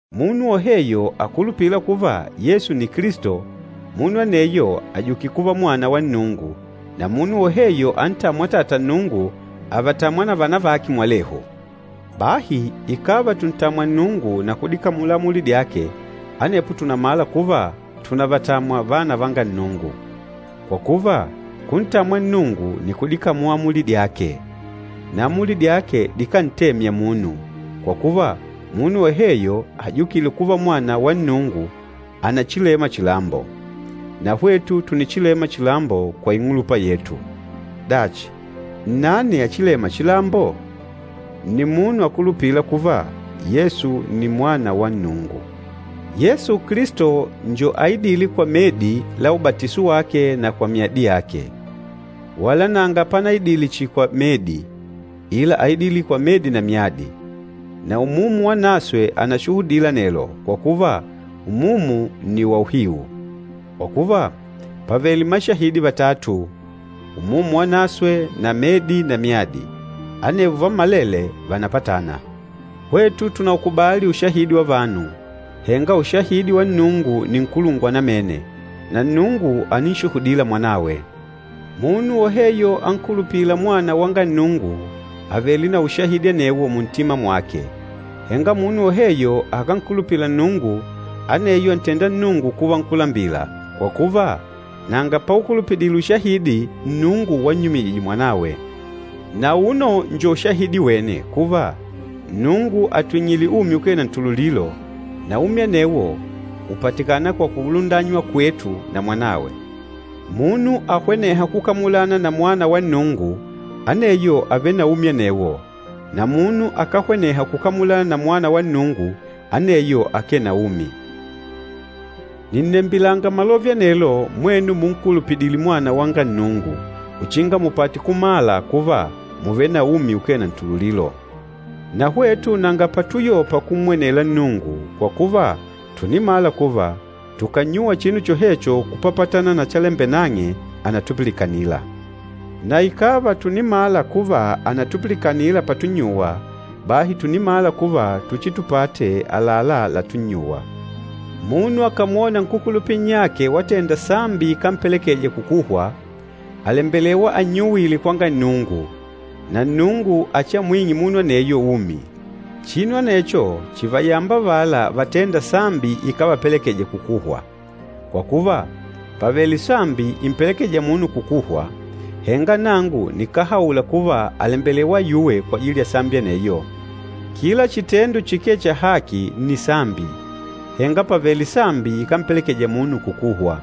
Munu woheyo akulupîla kuva, Yesu nni Kilisto, munu aneyo àjukile kuva mwana wa Nnungu, na munu woheyo antâmwa Atata Nnungu, àvatamwa na vana vake mwalehu. Bahi ikàva tùntamwa Nnungu na kudikamula amuli dyake, anepo tùnamala kuva tùnavatamwa vana vanga Nnungu. Kwa kuva, kuntamwa Nnungu nni kudikamula amuli dyake. Na amuli dyake dikántemya munu, kwa kuva munu woheyo ajukîle kuva mwana wa Nnungu ànachilema chilambo. Na hwetu tùnichilema chilambo kwa ing'ulupa yetu. Dachi, nnani achilêma chilambo? Nni munu akulupîla kuva Yesu nni Mwana wa Nnungu. Yesu Kilisto njo aidîle kwa medi la ubatiso wake na kwa myadi yake. Wala nanga panaidile chihi kwa medi, ila áidile kwa medi na myadi. Na Umumu Wanaswe ànashuhudila anelo, kwa kuva Umumu nni wa uhiu. Kwa kuva, pàvele mashahidi vatatu, Umumu Wanaswe na medi na myadi. Anevo vammalele vànapatana. Hwetu tùnaukubali ushahidi wa vanu, henga ushahidi wa Nnungu nni nkulungwa namene. Na Nnungu àninshuhudila Mwanawe. Munu woheyo ankulupîla Mwana wanga Nnungu àvele na ushahidi anewo muntima mwake. Henga munu woheyo akánkulupila Nnungu, aneyo àntenda Nnungu kuva nkúlambila, kwa kuva, nanga paukulupidile ushahidi Nnungu wannyumijije Mwanawe. Na auno njo ushahidi wene kuva, Nnungu àtwing'ile umi ukee na ntululilo, na umi anewo ùpatikana kwa kulundanywa kwetu na Mwanawe. Munu ahwenêha kukamulana na Mwana wa Nnungu, aneyo àvele na umi anewo, na munu akáhweneha kukamulana na Mwana wa Nnungu, aneyo akee na umi. Nìnnembilanga malove anelo mwenu munkulupidîle Mwana wanga Nnungu uchinga mupate kumala kuva mùvele na umi ukee na ntululilo. Na hwetu nanga patuyopa kummwenela Nnungu, kwa kuva tùnimala kuva tukànnyuwa chinu chohecho kupapatana na chalembela nang'e, ànatupilikanila. Na ikàva tùnimala kuva ànatupilikana patunnyuwa, bahi tùnimala kuva tuchitupate àlalá latunnyuwa. Munu akàmwona nkúkulupila nnyake watenda sambi ikámpelekeja kukuhwa, àlembelewa annyuwile kwanga Nnungu, na Nnungu achiamwing'e munu aneyo umi. Chinu anecho chìvayamba avala vatênda sambi ikávapelekeja kukuhwa. Kwa kuva, pàvele sambi impelekêja munu kukuhwa, henga nangu nikáhaula kuva àlembelewa ayuwe kwajili ya sambi aneyo. Kila chitendo chikee cha haki nni sambi, henga pàvele sambi ikámpelekeja munu kukuhwa.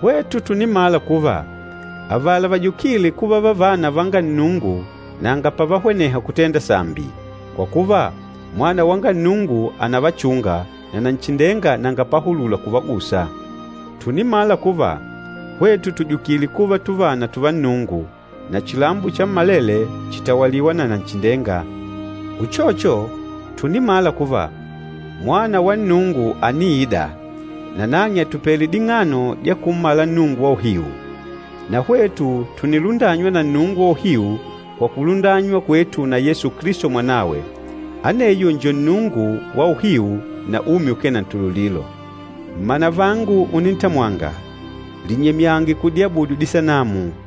Hwetu tùnimala kuva, avala vajukîle kuva vavana vanga Nnungu nanga pavahweneha kutenda sambi, kwa kuva Mwana wanga Nnungu ànavachunga, na Nanchindenga nanga pahulula kuvagusa. Tùnimala kuva, hwetu tùjukile kuva tuvana tùvá Nnungu, na chilambo chammalele chìtawaliwa na Nanchindenga. Uchocho, tùnimala kuva, Mwana wa Nnungu àniida, nanang'e àtupele ding'ano dya kummala Nnungu wa uhiu. Na hwetu tùnilundanywa na Nnungu wa uhiu kwa kulundanywa kwetu na Yesu Kilisto Mwanawe. Aneyo njo Nnungu wa uhiu na umi ukee na ntululilo. Mmanavangu unintamwanga, linyemyange kudiabudu disanamu.